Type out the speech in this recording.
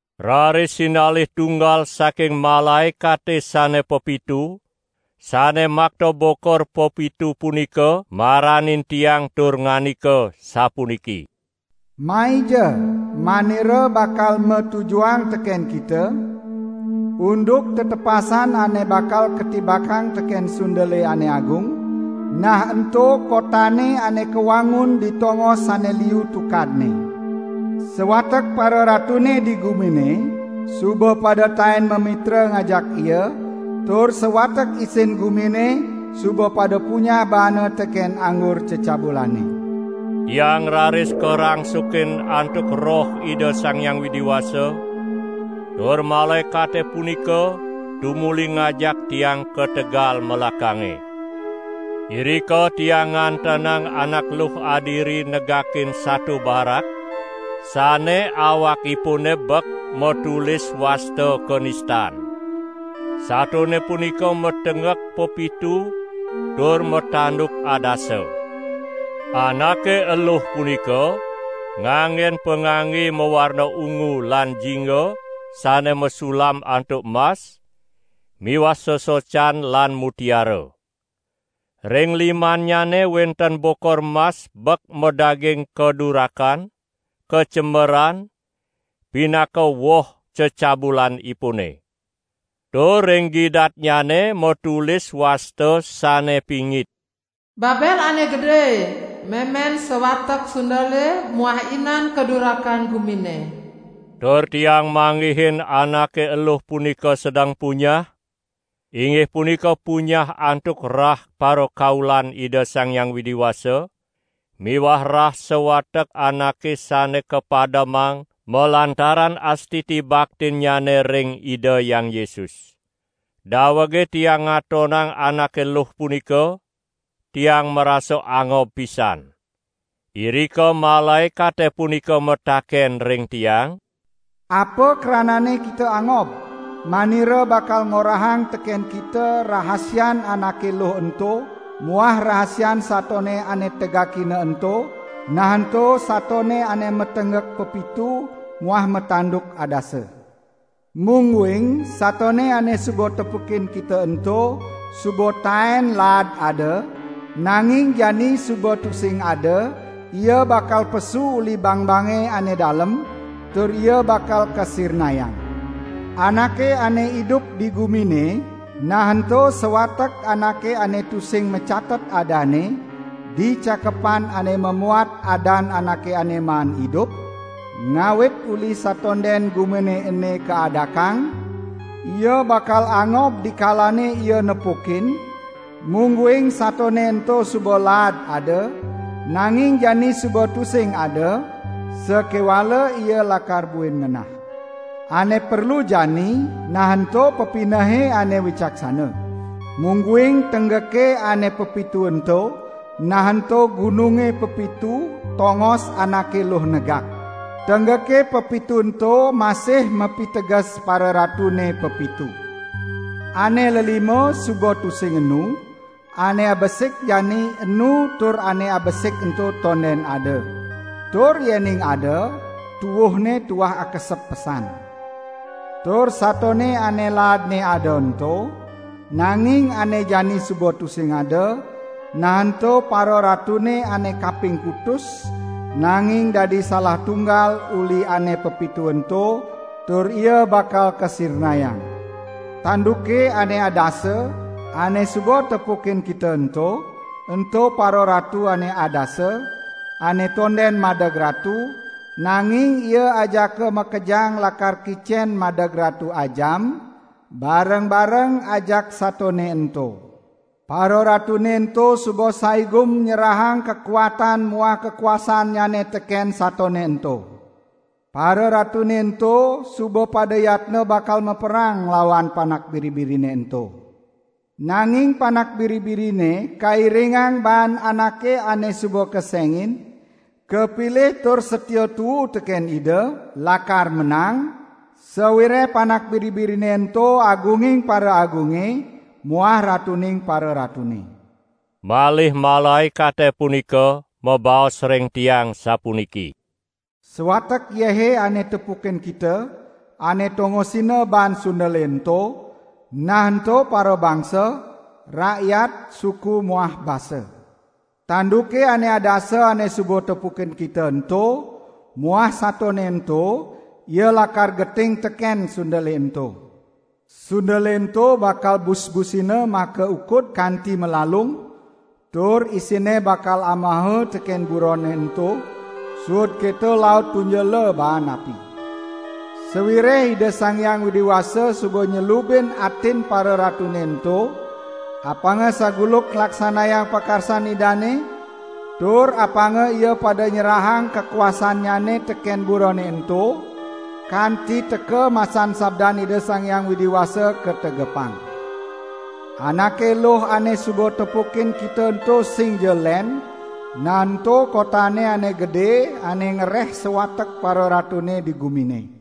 Raris sinalih tunggal saking malaekate sane pepitu, sane makta bokor pepitu punika maranin tiang tur ngandika sapuniki: "Maija, manira bakal matujuhang teken kita unduk tetepasan ane bakal katibakang teken sundele ane agung, nah ento kotane ane kawangun di tongos ane liu tukadne. Sawatek pararatune di gumine suba pada taen mamitra ngajak ia, tur sawatek isin gumine suba pada punyah baana teken anggur cecabulane." Tiang raris karangsukin antuk Roh Ida Sang Hyang Widi Wasa, tur malaekate punika tumuli ngajak tiang ka tegal melakange. Irika tiang ngantenang anak luh adiri negakin sato barak, sane awakipune bek matulis wasta kanistan. Satone punika matenggek pepitu tur matanduk adasa. Anake eluh punika nganggen pangangge mawarna ungu lan jingga sane masulam antuk mas miwah sesocan lan mutiara. Ring limannyane wenten bokor mas ebek madaging kadurakan, kacemeran, pinaka woh cecabulanipune. Tur ring gidatnyane matulis wasta sane pingit: "Babel ane gede, memen sawatek sundele muah inan kadurakan gumine." Tur tiang manggihin anake eluh punika sedeng punyah, inggih punika punyah antuk rah parakaulan Ida Sang Hyang Widi Wasa miwah rah sawatek anake sane kapademang malantaran astiti baktinnyane ring Ida Hyang Yesus. Dawege tiang ngatonang anake luh punika, tiang marasa angob pisan. Irika malaekate punika mataken ring tiang: "Apa kranane kita angob? Manira bakal ngorahang teken kita rahasian anake luh ento muah rahasian satone ane tegakina ento, nah ento satone ane matenggek pepitu muah matanduk adasa. Mungguing satone ane suba tepukin kita ento, suba taen laad ada, nanging jani suba tusing ada, ia bakal pesu uli bangbange ane dalem, tur ia bakal kasirnayang. Anake ane idup di gumine, nah ento sawatek anake ane tusing macatet adanne di cakepan ane mamuat adan anake ane maan idup, ngawit uli satonden gumine ene kaadakang, ia bakal angob dikalane ia nepukin mungguing satone ento suba laad ada, nanging jani suba tusing ada, sakewala ia lakar buin ngenah. Ane perlu jani, nah ento pepinehe ane wicaksana! Mungguing tenggeke ane pepitu ento, nah ento gununge pepitu tongos anake luh negak. Tenggeke pepitu ento masih mapiteges pararatune pepitu. Ane lelima suba tusing enu, ane abesik jani enu tur ane abesik ento tonden ada. Tur yening ada, tuuhne tuah akesep pesan. Tur satone ane laadne ada ento, nanging ane jani suba tusing ada, nah ento pararatune ane kaping kutus, nanging dadi salah tunggal uli ane pepitu ento, tur ia bakal kasirnayang. Tanduke ane adasa, ane suba tepukin kita ento, ento pararatu ane adasa, ane tonden madeg ratu, nanging ia ajaka makejang lakar kicen madeg ratu ajam, bareng-bareng ajak satone ento. Pararatune ento suba saigum nyerahang kakuatan muah kakuasannyane teken satone ento. Pararatune ento suba pada yatna bakal maperang nglawan Panak Biri-birine ento. Nanging Panak Biri-birine kairingang baan anake ane suba kesengin, kapilih tur satia tuu teken Ida, lakar menang, sawireh Panak Biri-birine ento Agunging paraagunge muah Ratuning pararatune." Malih malaekate punika mabaos ring tiang sapuniki: "Sawatek yehe ane tepukin kita, ane tongosina baan sundele ento, nah ento parabangsa, rakyat, suku muah basa. Tanduke ane adasa ane suba tepukin kita ento muah satone ento, ia lakar geting teken sundele ento. Sundele ento bakal busbusina makaukud kanti malalung, tur isinne bakal amaha teken burone ento, suud keto laut tunjela baan api. Sawireh Ida Sang Hyang Widi Wasa suba nyelubin atin pararatune ento apanga saguluk nglaksanayang pakarsan Idane, tur apanga ia pada nyerahang kakuasannyane teken burone ento, kanti teka masan sabdan Ida Sang Hyang Widi Wasa kategepang. Anake eluh ane suba tepukin kita ento singja len, nah ento kotane ane gede ane ngereh sawatek pararatune di gumine."